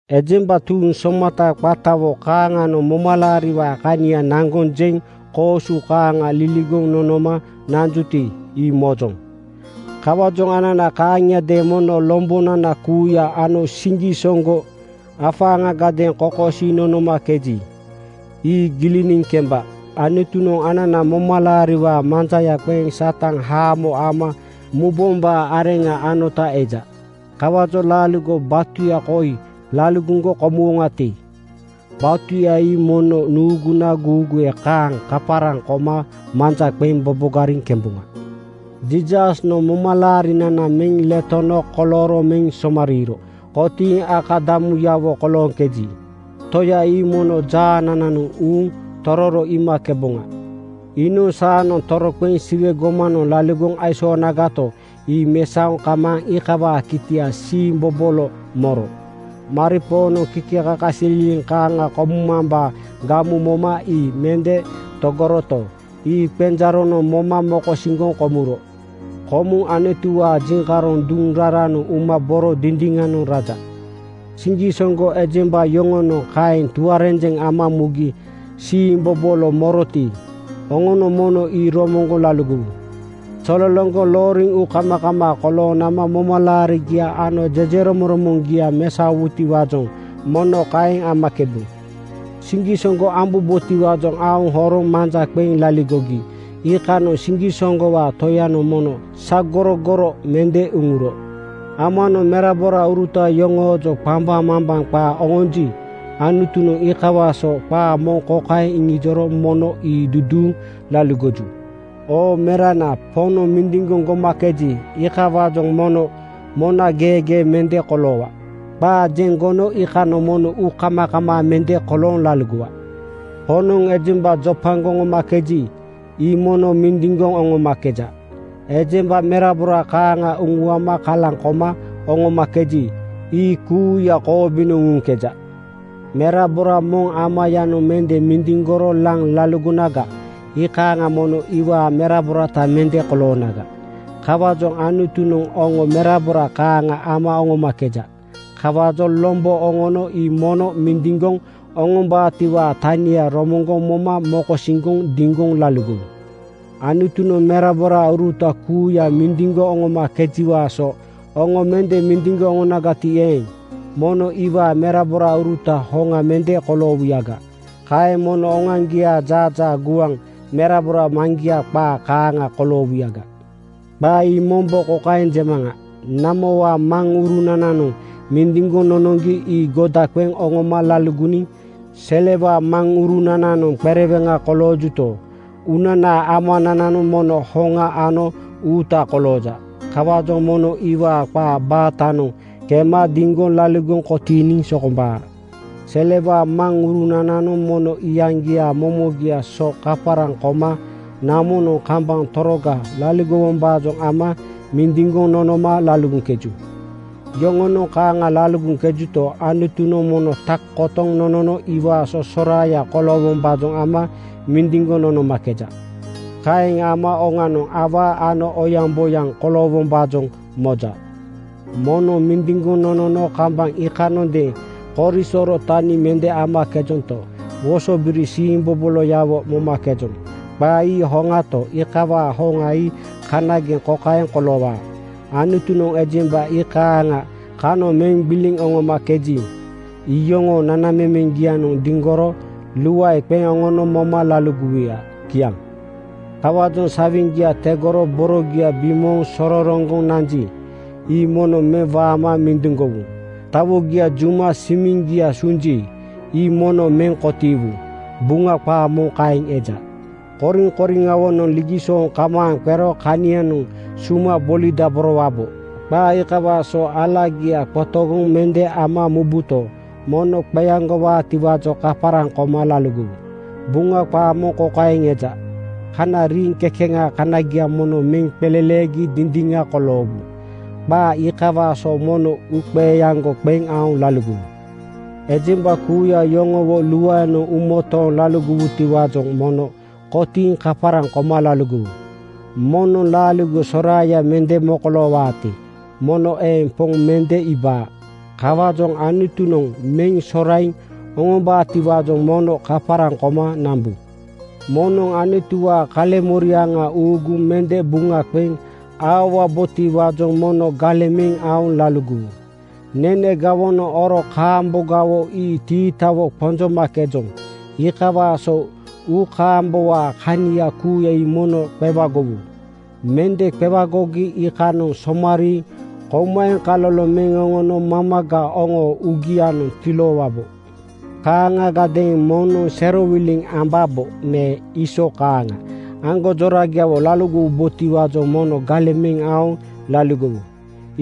Ejemba tuuŋ somata qatawo kaaŋanoŋ momalaariwaa kania naŋgoŋ jeŋ koosu kaaŋa liligoŋ nonoma nanjuti, ii mojoŋ. Kawaajoŋ anana kaaŋiadeeŋ mono lombonana kuuya ano siŋgisoŋgo afaaŋagadeeŋ kokosiiŋ nonomakeji, ii giliniŋ kemba. Anutunoŋ anana momalaariwaa manjaya qeŋ Satan haamo ama mubombaa areŋa anota eja. Kawaajoŋ laaligo batuya koi laligoŋgo komuwoŋati, batuya ii mono nuuguna guuguwe kaaŋ kaparaŋ koma manja qeŋ bobogariŋ kemboŋa. Jiisasnoŋ momalaarinana meŋ letono kolooro meŋ somariiro kotiiŋ akadamuyawo kolooŋkeji, Toya ii mono jaanananoŋ uuŋ tororo iimakeboŋa. Iinoŋ saanoŋ toroqeŋ Siwe gomanoŋ laligoŋ aisoonagato, ii mesaoŋ kamaaŋ iikawaa kitia siimbobolo moro. Maripoonoŋ kikekakasililiŋ kaaŋa komumambaa gamu moma ii mende togoroto, ii qenjaaronoŋ moma mokosiŋgoŋ komuro. Komuŋ Anutuwaa jiŋkaroŋ duŋ raranoŋ uma boro dindiŋanoŋ raja. Siŋgisoŋgo ejemba yoŋonoŋ kaeŋ tuarenjeŋ ama mugi siimbobolo moroti, oŋonoŋ mono ii romoŋgoŋ laligowu. Zolologoŋ looriŋ uukamakamaa kolooŋ nama momalaarigia ano jejeromoŋromoŋgia mesaowubotiwaajoŋ mono kaeŋ amakebu. Siŋgisoŋgo ambombotiwaajoŋ aoŋ oroŋ manja qeŋ laligogi iikanoŋ siŋgisoŋgowaa Toyanoŋ mono sagorogoro (gbilibambaŋ) mende uŋuro. Amanoŋ meraborauruta yoŋoojoŋ qambaŋmambaŋ qaa oŋonji, Anutunoŋ iikawaa so qaa moŋ kokaeŋ iŋijoro mono ii duduuŋ laligoju, “Oo merana, Poŋnoŋ mindiŋgoŋ gomakeji, iikawaajoŋ mono mona geegee mende koloowa. Qaa jeŋ gono iikanoŋ mono uukamakamaa mende kolooŋ laligowa. Poŋnoŋ ejemba jopagoŋ oŋomakeji, ii mono mindiŋgoŋ oŋomakeja. Ejemba merabora kaaŋa uŋuama kalaŋ koma oŋomakeji, ii kuuya koobinoŋ uŋuŋkeja.” Merabora moŋ amayanoŋ mende mindiŋgoro laŋ laligonaga, iikaaŋa mono iwaa meraborata mende koloonaga. Kawaajoŋ Anutunoŋ oŋo merabora kaaŋa ama oŋomakeja. Kawaajoŋ lombo oŋono ii mono mindiŋgoŋ oŋombaatiwaa tania romoŋgoŋ moma mokosiŋgoŋ diŋgoŋ laligowu. Anutunoŋ meraborauruta kuuya mindiŋgoŋ oŋomakejiwaa so oŋo mende mindiŋgoŋ oŋonagati eeŋ, mono iwaa meraborauruta hoŋa mende koloowuyaga. Kaeŋ mono oŋoaŋgiaa jaajaa gua merabora maŋgia qaa kaaŋa koloowuyaga. Qaa ii mombo kokaeŋ jemaŋa: Namowaa maŋurunananoŋ mindiŋgoŋ nonoŋgi ii goda qeŋ oŋoma laligoniŋ. Selewaa maŋurunananoŋ qereweŋa koloojuto, uunanaa Amanananoŋ mono hoŋa ano uuta kolooja. Kawaajoŋ mono iwaa qaa baatanoŋ kema diŋgoŋ laligoŋ kotiiniŋ sokombaa. Selewaa maŋrunananoŋ mono iyaŋgiaa momogiaa so kaparaŋ koma namonoŋ kambaŋ toroga laligowombaajoŋ ama mindiŋgoŋ nonoma laligoŋkeju. Yoŋonoŋ kaaŋa laligoŋkejuto, Anutunoŋ mono tak kotoŋ nonono iwaa so soraaya koloowombaajoŋ ama mindiŋgoŋ nonomakeja. Kaeŋ ama oŋanoŋ awaa ano oyaŋboyaŋ koloowombaajoŋ moja. Moŋnoŋ mindiŋgoŋ nonono kambaŋ iikanondeeŋ korisoro tani mende amakejonto, wosobiri siimboboloyawo momakejoŋ. Qaa ii hoŋato, iikawaa hoŋa ii kanageŋ kokaeŋ koloowaa: Anutunoŋ ejemba iikaaŋa kanoŋ meŋ gbiliŋ oŋomakeji, iyoŋoo nanamemeŋgianoŋ diŋgoro luae qeŋ oŋono moma laligowuya. Kiaŋ. Kawaajoŋ “Sawiŋgia tegoro borogia bimooŋ sororoŋgoŋ nanji, ii mono meŋ waama mindiŋgowu. Tawogia juma simiŋgia sunji, ii mono meŋ kotiiwu.” Buŋa qaa moŋ kaeŋ eja. Koriŋkoriŋawonoŋ ligisooŋ kamaaŋ qero kanianoŋ suma bolidaborowabo. Qaa iikawaa so alagia qotogoŋ mende ama mubuto, mono qeaŋgowaatiwaajoŋ kaparaŋ koma laligowu. Buŋa qaa moŋ kokaeŋ eja, “Kana riiŋ kekeŋaa kanagia mono meŋ qeleleegi dindiŋa koloowu.” Qaa iikawaa so mono uuqeaŋgoŋ qeŋ aoŋ laligowu. Ejemba kuuya yoŋowo luaenoŋ uumotooŋ laligowutiwaajoŋ mono kotiiŋ kaparaŋ koma laligowu. Moŋnoŋ laaligo soraaya mende mokoloowaati, mono eeŋ Poŋ mende iibaa. Kawaajoŋ Anutunoŋ meŋ soraiŋ oŋombaatiwaajoŋ mono kaparaŋ koma nambu. Moŋnoŋ Anutuwaa kaleŋmoriaŋa uuguŋ mende buŋa qeŋ aowabotiwaajoŋ mono galeŋ meŋ aoŋ laligowu. Nene gawonoŋ oro kaambogawo ii tiitawo qonjomakejoŋ. Iikawaa so uukaambowaa kania kuuya ii mono qewagowu. Mende qewagogi iikanoŋ somariiŋ kouma eŋkaloloŋ meŋ oŋono mamaga oŋoo uugianoŋ tiloowabo. Kaaŋagadeeŋ moŋnoŋ serowiliŋ ambabo me Iisoo (Eesau) kaaŋa aŋgonjorayawo laligowabotiwaajoŋ mono galeŋ meŋ aoŋ laligowu.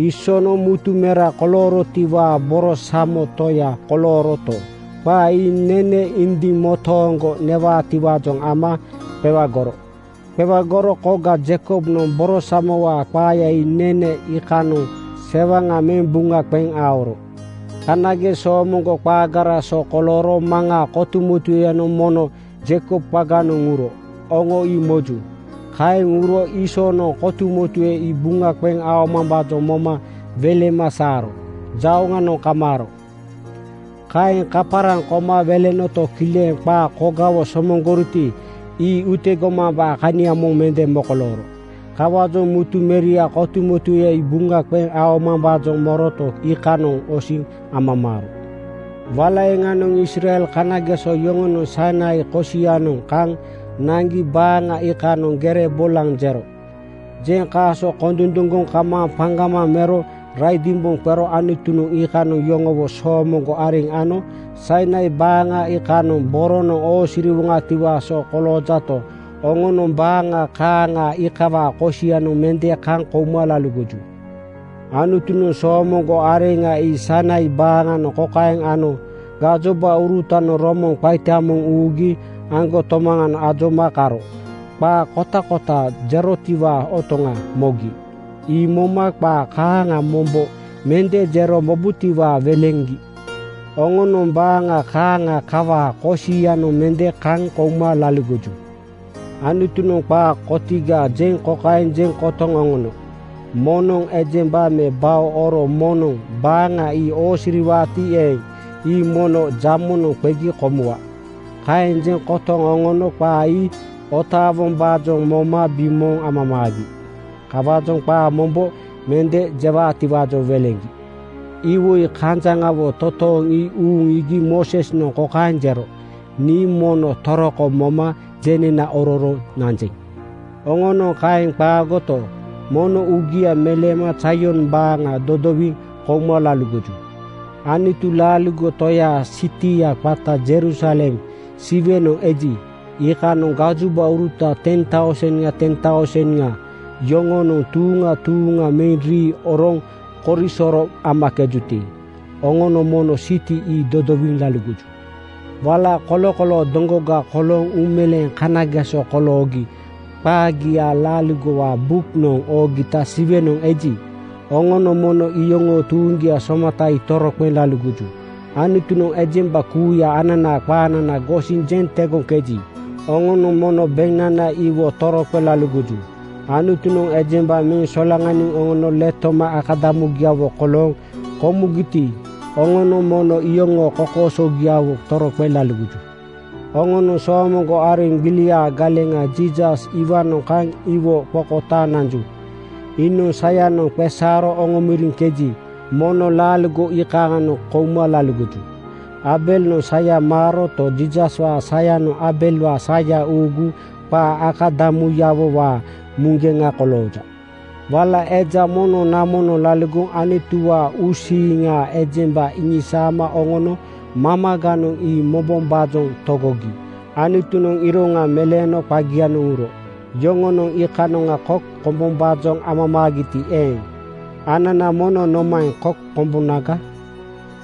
Iisoonoŋ mutu mera koloorotiwaa borosamo toya kolooroto, qaa ii nene indiŋ motooŋgo newaatiwaajoŋ ama qewagoro. Qewagoro koga Jeikobnoŋ borosamowaa qaaya ii nene iikanoŋ sewaŋa meŋ buŋa qeŋ aoro. Kanageŋ soomoŋgo qaagaraa so kolooro Maŋaa kotumotueyanoŋ mono Jeikob qaganoŋ uro, oŋo ii moju. Kaeŋ uro Iisoonoŋ kotumotue ii buŋa qeŋ aomambaajoŋ moma welema saaro jauŋanoŋ kamaaro. Kaeŋ kaparaŋ koma welenoto, kileŋ qaa kogawo somoŋgoriti, ii utegomambaa kania moŋ mende mokolooro. Kawaajoŋ mutu meriaa kotumotueya ii buŋa qeŋ aomambaajoŋ moroto, iikanoŋ osiŋ amamaaro. Wala eeŋanoŋ Israel kanageso yoŋonoŋ Sainai (Sinai) kosianoŋ kaŋ naŋgi baaŋa iikanoŋ gere bolanoŋ jero. Jeŋ kaaso kondunduŋgoŋ kamaaŋ paŋgamaŋ mero raidimboŋ qero Anutunoŋ iikanoŋ yoŋowo soomoŋgo areŋ ano. Sainai (Sinai) baaŋa iikanoŋ boronoŋ oosiriwoŋatiwaa so koloojato, oŋonoŋ baaŋa kaaŋa iikawaa kosianoŋ mende kaŋ kouma laligoju. Anutunoŋ soomoŋgo areŋa ii Sainai baaŋanoŋ kokaeŋ ano: Gajobaurutanoŋ romoŋ qaita moŋ uugi aŋgotomaŋa ajoma karo qaa kotakota jerotiwaa otoŋa mogi. Ii moma qaa kaaŋa mombo mende jero mobutiwaajoŋ weleŋgi. Oŋonoŋ baaŋa kaaŋa kawaa kosianoŋ mende kaŋ kouma laligoju. Anutunoŋ qaa kotiga jeŋ kokaeŋ jeŋ kotoŋ oŋono, “Moŋnoŋ ejemba me bao oro moŋnoŋ baaŋa ii oosiriwaati eeŋ, ii mono jamonoŋ qegi komuwa.” Kaeŋ jeŋ kotoŋ oŋono qaa ii otaawombaajoŋ moma bimooŋ amamaagi. Kawaajoŋ qaa mombo mende jewaatiwaajoŋ weleŋgi. Iwoi kanjaŋawo totooŋ ii uuŋ iigi Moosesnoŋ kokaeŋ jero, “Nii mono toroko moma jenena ororo nanjeŋ.” Oŋonoŋ kaeŋ qaagoto, mono uugia meleema Zaion baaŋa dodowiŋ kouma laligoju. Anutu laaligo Toyaa sitia qata Jerusalem Siwenoŋ eji, iikanoŋ gajobauruta ten tauseŋa ten tauseŋa yoŋonoŋ tuuŋa tuuŋa meŋ rii oroŋ korisoro amakejuti, oŋonoŋ mono siti ii dodowiŋ laligoju. Wala kolokoloo doŋgoga kolooŋ uumeleeŋ kanageso koloogi qagia Laaligowaa buknoŋ oogita Siwenoŋ eji, oŋonoŋ mono iyoŋoo tuuŋgia somata ii toroqeŋ laligoju. Anutunoŋ ejemba kuuya ananaa qaanana gosiŋ jeŋ tegoŋkeji, oŋonoŋ mono beŋnana iwo toroqeŋ laligoju. Anutunoŋ ejemba meŋ solaŋaniŋ oŋono letoma akadamugiawo kolooŋ komugiti, oŋonoŋ mono iyoŋoo kokoosogiawo toroqeŋ laligoju. Oŋonoŋ soomoŋgo areŋ gbiliaa galeŋa Jiisas iwaanoŋ kaŋ iwo qokotaaŋ nanju. Iinoŋ sayanoŋ qeesaaro oŋomoriŋkeji, mono laaligo iikaaŋanoŋ kouma laligoju. Aabelnoŋ saya maaroto, Jiisaswaa sayanoŋ Aabelwaa saya uuguŋ qaa akadamuyawowaa muŋgeŋa kolooja. Wala eja moŋnoŋ namonoŋ laligoŋ Anutuwaa uusiiŋa ejemba iŋisaama oŋono mamaganoŋ ii mobombaajoŋ togogi Anutunoŋ iroŋa meleeno qagianoŋ uro. Yoŋonoŋ iikanoŋa kok kombombaajoŋ amamaagiti eeŋ, anana mono nomaeŋ kok komboŋaga?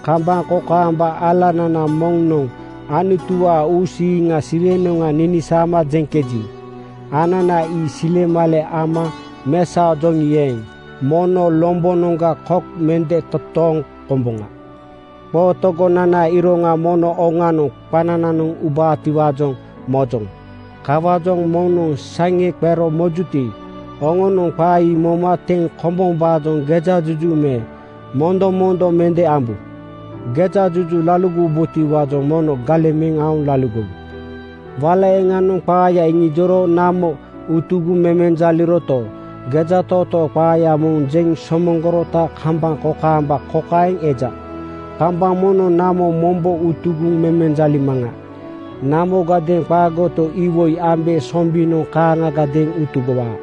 Kambaŋ kokaamba alanana moŋnoŋ Anutuwaa uusiiŋa Siwenoŋga ninisaama jeŋkeji, anana ii silemale ama mesaojoŋi eeŋ, mono lombonoŋga kok mende totooŋ komboŋa. Qootogonanaa iroŋa mono oŋanoŋ qanananoŋ ubaatiwaajoŋ mojoŋ. Kawaajoŋ moŋnoŋ saŋe qero mojuti, oŋonoŋ qaa ii moma teŋ kombombaajoŋ gejajuju me mondomondo mende ambu. Gejajuju laligowubotiwaajoŋ mono galeŋ meŋ aoŋ laligowu. Wala eeŋanoŋ qaaya iŋijoro namo utugoŋ memenjaliroto, gejatootoo qaaya moŋ jeŋ somoŋgorota kambaŋ kokaamba kokaeŋ eja, “Kambaŋ moŋnoŋ namo mombo utugoŋ memenjalimaŋa. Namogadeeŋ qaagoto, iwoi ambe sombinoŋ kaaŋagadeeŋ utugowaa.”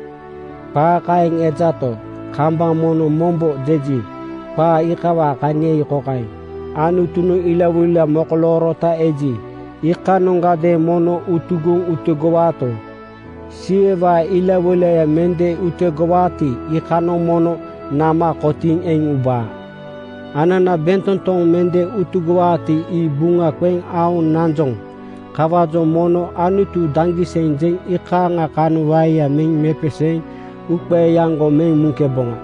Qaa kaeŋ ejato, “Kambaŋ moŋnoŋ mombo” jeji, qaa iikawaa kania ii kokaeŋ: Anutunoŋ ilawoila mokoloorota eji, iikanoŋgadeeŋ mono utugoŋ utegowaato, Siwewaa ilawoila mende utugowaati, iikanoŋ mono nama kotiiŋ eŋ ubaa. Anana bentotoŋ mende utugowaati, ii buŋa qeŋ aoŋ nanjoŋ. Kawaajoŋ mono “Anutu daŋgiseŋ!” jeŋ iikaaŋa kanoŋ waeya meŋ mepeseeŋ uuqeeaŋgo meŋ muŋkeboŋa.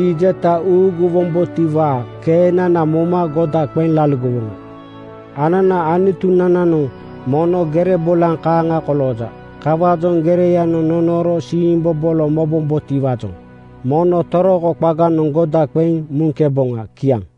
Ii jeta uuguwombotiwaa keenana moma goda qeŋ laligowoŋa. Ananaa Anutunananoŋ mono gere bolaŋ kaaŋa kolooja. Kawaajoŋ gereyanoŋ nonooro siimbobolo mobombotiwaajoŋ mono toroko qaganoŋ goda qeŋ muŋkeboŋa. Kiaŋ.